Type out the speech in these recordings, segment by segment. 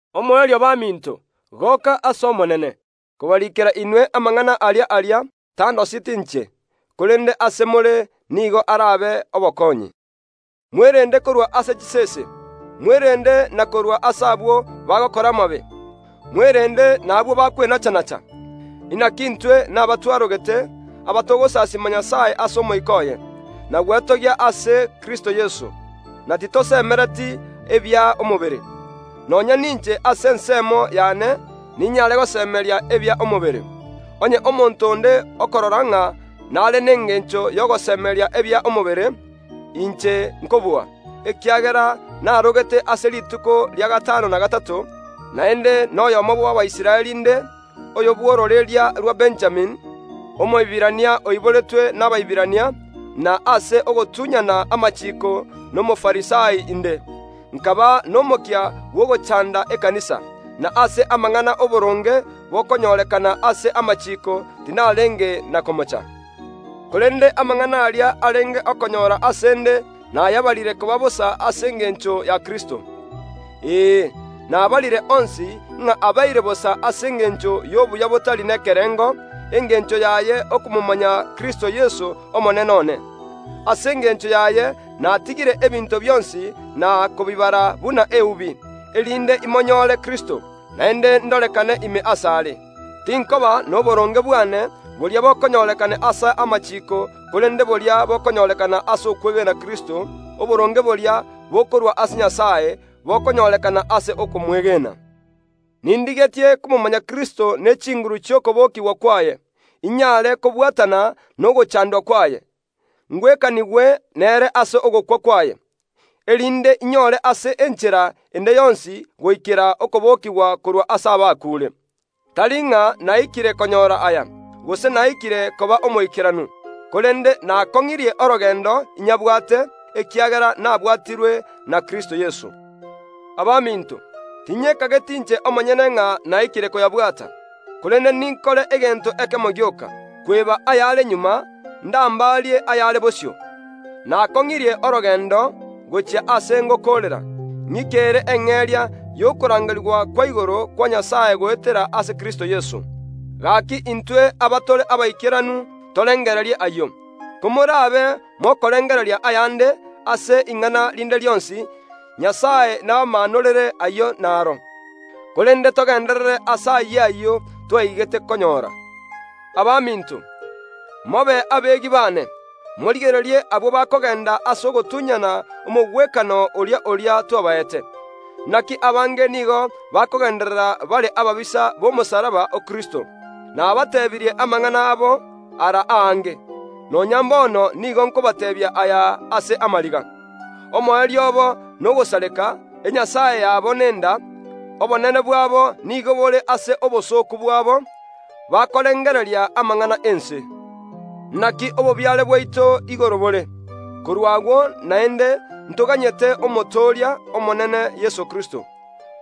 Omoerio baminto, goka ase Omonene! Kobariikera inwe amang’ana aria aria tandoseti inche, korende ase more nigo arabe obokonyi. Mwerende korwa ase chisese, mwerende na korwa ase abwo bagokora amabe, mwerende nabwo bakwenachanacha! Naki intwe naba twarogete, abatogosasiima Nyasae ase Omoika oye, na gwetogia ase Kristo Yeso, na titosemereti ebia omobere. Nonya ninche ase ensemo yane ninyare gosemeria ebia omobere. Onye omonto onde okorora ng’a nare nengencho y’ogosemeria ebia omobere, inche nkobua, ekiagera narogete ase rituko ria gatano na gatato, naende noyomo bw’Abaisraeli inde, oyo bw’ororeria rwa Benjamini, Omoiberania oiboretwe n’Abaiberania, na ase ogotunyana amachiiko n’Omofarisai inde. Nkaba nomokia bw’ogochanda ekanisa, na ase amang’ana ’oboronge bokonyorekana ase amachiiko tinarenge na komocha. Korende amang’ana aria arenge okonyora ase ’nde nayabarire koba bosa ase engencho ya Kristo. Ee, nabarire onsi, ng’a abeire bosa ase engencho y’obuya botari nekerengo, engencho yaye okomomanya Kristo Yese Omonene one. Ase engencho yaye natigire ebinto bionsi, na kobibara buna eubi, erinde imonyore Kristo, naende ndorekane ime asare. Tinkoba noboronge bwane boria bokonyorekana ase amachiiko korende boria bokonyorekana ase okomwegena Kristo, oboronge boria bokorwa ase Nyasae, bokonyorekana ase okomwegena. Nindigetie komomanya Kristo ne chinguru chi’okobokigwa kwaye, inyare kobwatana nogochandwa kwaye, ngwekanigwe nere ase ogokwa kwaye; erinde inyore ase enchera ende yonsi goikera okobokigwa korwa ase abakuure. Tari ng’a naikire konyora aya, gose naikire koba omoikeranu, korende nakong’irie orogendo inyabwate, ekiagera nabwatirwe na Kristo Yeso. Abaminto, tinyekageti inche omonyene ng’a naikire koyabwata; korende ninkore egento ekemo gioka: kweba ayare magega, ndambaarie ayare bosio. Nakong’irie orogendo gochia aase ngokoorera, ng’ikere eng’eria y’okorangerigwa kwa igoro kwa Nyasae goetera ase Kristo Yeso. Gaki intwe abatore abaikeranu torengererie ayio. Komorabe mokorengereria ayande, ase ing’ana rinde rionsi, Nyasae nabamaanorere ayio naro. Korende togenderere ase ayio ayio twaigete konyora. Abaminto, mobe abeegi baane, morigererie abwo bakogenda ase ogotunyana omogwekano oria oria twabaete. Naki abange nigo bakogenderera bare ababisa b’omosalaba o Kristo. Nabatebirie amang’ana abo ara aange, nonya mbono nigo nkobateebia aya ase amariga. Omoerio obo nogosareka, enyasae yabo nenda, obonene bwabo nigo bore ase obosooku bwabo, bakorengereria amang’ana ’ense. Naki obobiare bwaito igoro, bore. Korwa agwo naende ntoganyete, Omotooria, Omonene Yeso Kristo,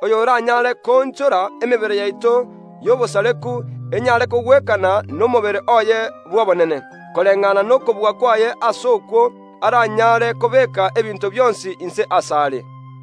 oyoranyare koonchora emebere yaito y’obosareku enyare kogwekana nomobere oye bw’obonene, koreng’ana nokobua kwaye ase okwo aranyare kobeeka ebinto bionsi inse asare.